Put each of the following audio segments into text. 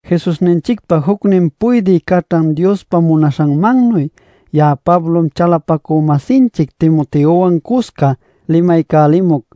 Jesusninchicpa jucnin puydï caćhan Diospa munaśhanmannuy ya'a Pablom chalapacü-masinchic Timoteowan cuscá limaycälimuc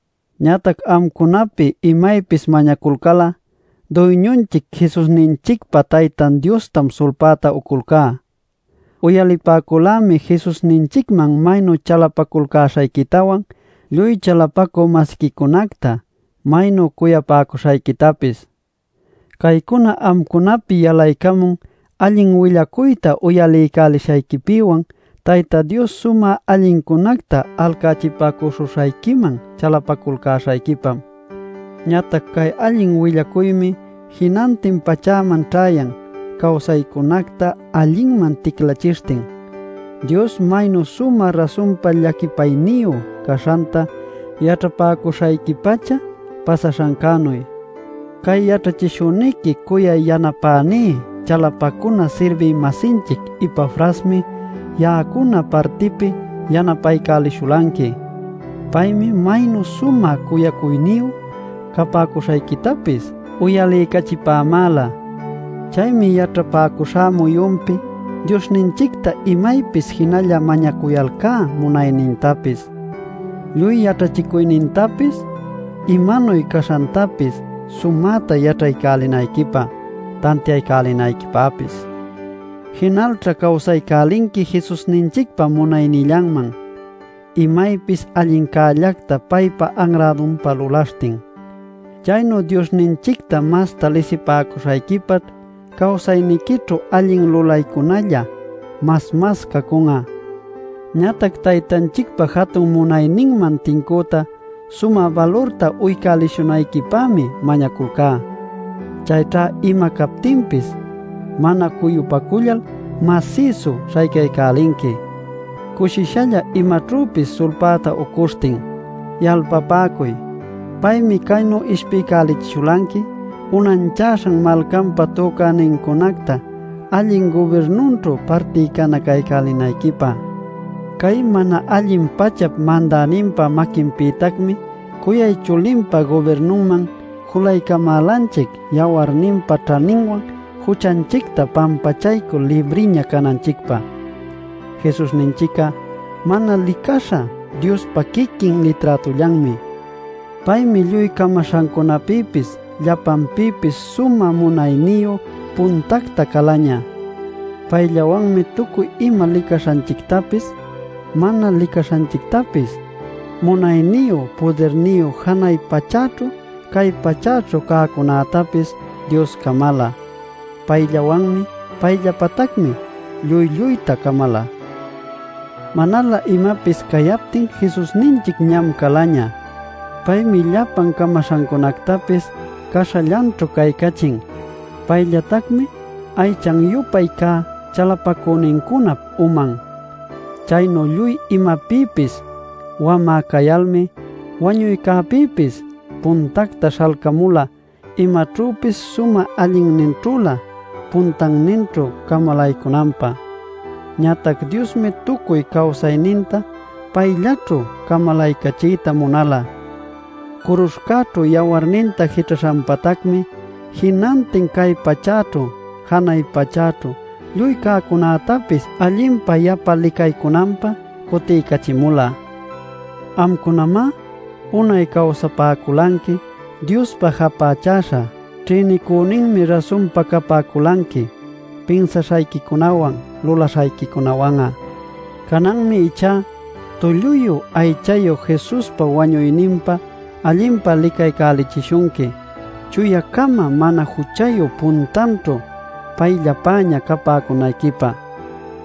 Ñatac amcunapi imaypis mañaculcal'a Duyñunchic Jesusninchicpa Taytan Diostam sulpäta uculcá. Uyalipäculämi Jesusninchicman maynu chalapaculcäśhayquitawan, lluy chalapacü-masiquicunacta maynu cuyapäcuśhayquitapis. Caycuna amcunapi yalaycamun allin willacuyta uyalipäcuśhayquipïwan Tayta Dios sumä allincunacta alcachipäcuśhuśhayquiman chalapaculcäśhayquipam. Ñatac cay allin willacuymi jinantin pachäman ćhayan cawsaycunacta allinman ticlachishtin Dios maynu sumä rasunpa llaquipayniyu caśhanta yaćhapäcuśhayqui-pacha pasaśhancänu. Cay yaćhachishüniqui cuyay yanapäní chalapacuna sirbï-masinchic Epafrasmi ya'acuna partipi yanapaycälishulanqui. Paymi maynu sumä cuyacuyniyu capäcuśhayquitapis uyaliycachipämäla. Chaymi yaćhapäcuśhá muyunpi Diosninchicta imaypis jinalla mañacuyalcá munaynintapis, lluy yaćhachicuynintapis, imanuy caśhantapis sumäta yaćhaycälinayquipä tantiaycälinayquipäpis. Jinalćha cawsaycälinqui Jesusninchicpa munaynillanman, imaypis allincällacta paypa anrädunpä lulaśhtin. Chaynu Diosninchicta masta lisipäcuśhayquipaćh cawsayniquićhu allin lulaycunalla mas mas caycun'a. Ñatac Taytanchicpa jatun munayninman tincüta sumä balurta uycälishunayquipämi mañaculcá. Chayćha ima captinpis mana cuyupacullal masïsu śhaycaycälinqui cushishalla imaćhüpis sulpäta ucuśhtin. Yalpapäcuy: paymi caynu ishpiycälichishulanqui unanchaśhan malcanpa tücänincunacta allin gubirnunćhu partinacaycälinayquipä. Cay mana allin pachap mandäninpa maquinpïtacmi cuyay chulinpa gubirnunman julaycamälanchic yawarninpa ćhaninwan juchanchicta pampachaycul libriña cananchicpä. Jesusninchic'a mana licaśha Diospa quiquin liträtullanmi. Paymi lluy camaśhancunapïpis llapanpïpis sumä munayniyu puntacta calaña. Payllawanmi tucuy ima licaśhanchictapis, mana licaśhanchictapis, munayniyu pudirniyu janay pachäćhu, cay pachäćhu cäcunätapis Dios camala. Payllawanmi payllapätacmi lluy lluyta camala. Manalä imapis cayaptin Jesusninchic ñam calaña. Paymi llapan camaśhacunactapis caśhallanćhu caycachin. Paytacmi aychan-yupay cä chalapacünincunap uman. Chaynu lluy imapïpis wamä cayalmi wañuycäpïpis puntacta śhalcamula imaćhüpis sumä allinninćhülä puntanninćhu camalaycunanpä. Ñatac Diosmi tucuy cawsayninta payllaćhu camalaycachiyta munala. Curuśhcäćhu yawarninta jićhaśhanpatacmi jinantin cay pachäćhu janay pachäćhu lluy cäcunätapis allinpa yapa licaycunanpä cutiycachimula. Amcunamá unay cawsapäculanqui Diospa japächäśha. Ćhïnicüninmi rasunpa capäculanqui pinsaśhayquicunäwan, lulaśhayquicunäwan'a. Cananmi ichá tulluyu aychayu Jesuspa wañuyninpa allinpa licaycälichishunqui, chuya-cama, mana juchayu puntanćhu, payllapäña capäcunayquipä.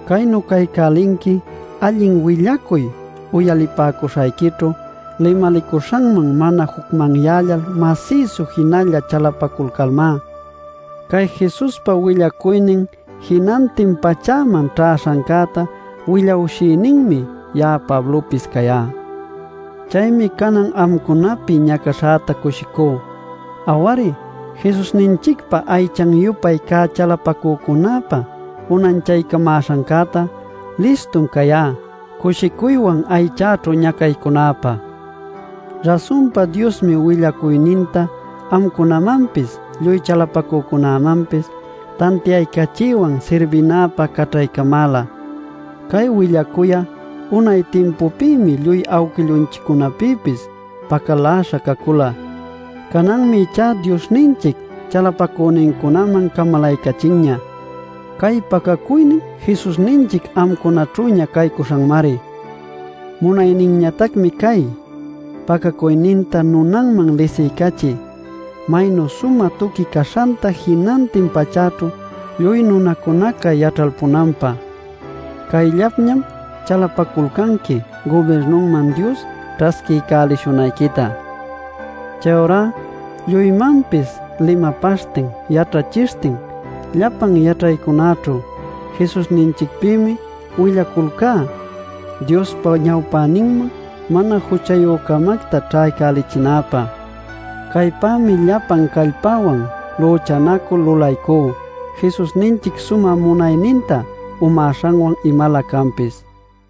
Caynu caycälinqui allin willacuy uyalipäcuśhayquićhu limalicuśhanman mana jucmanyällal masïsu jinalla chalapaculmá. Cay Jesuspa willacuynin jinantin pachäman ćhäśhancäta willawshïninmi ya'a Pablopis cayá. Chaymi canan amcunapi ñacaśhäta cushicú. Aw-ari, Jesusninchicpa aychan-yupay cä chalapacücunäpä unanchaycamäśhancäta listum cayá cushicuywan aychäćhu ñacaycunäpä. Rasunpa Diosmi willacuyninta amcunamanpis lluy chalapacücunämanpis tantiaycachiywan sirbinäpä caćhaycamäla. Cay willacuy'a unay timpupïmi lluy awquillunchiccunapïpis pacaläśha cacula. Cananmi ichá Diosninchic chalapacünincunaman camalaycachinña. Cay pacacuynin Jesusninchic amcunaćhüña cayäśhancämari. Munayninñatacmi cay: pacacuyninta nunanman lisiycachiy, maynu sumä tuqui caśhanta jinantin pachäćhu lluy nunacunaca yaćhalpunanpä. Cayllapñam chalapaculcanqui gubirnunman Dios ćhasquiycälishunayquita. Chayurá lluymanpis limapaśhtin, yaćhachishtin llapan yaćhaycunäćhu Jesusninchicpïmi willaculcá Diospa ñawpäninman mana juchayü-camacta ćhaycälichinäpä. Caypämi llapan callpäwan lüchanacul lulaycú Jesusninchic sumä munayninta umäśhanwan imalä canpis.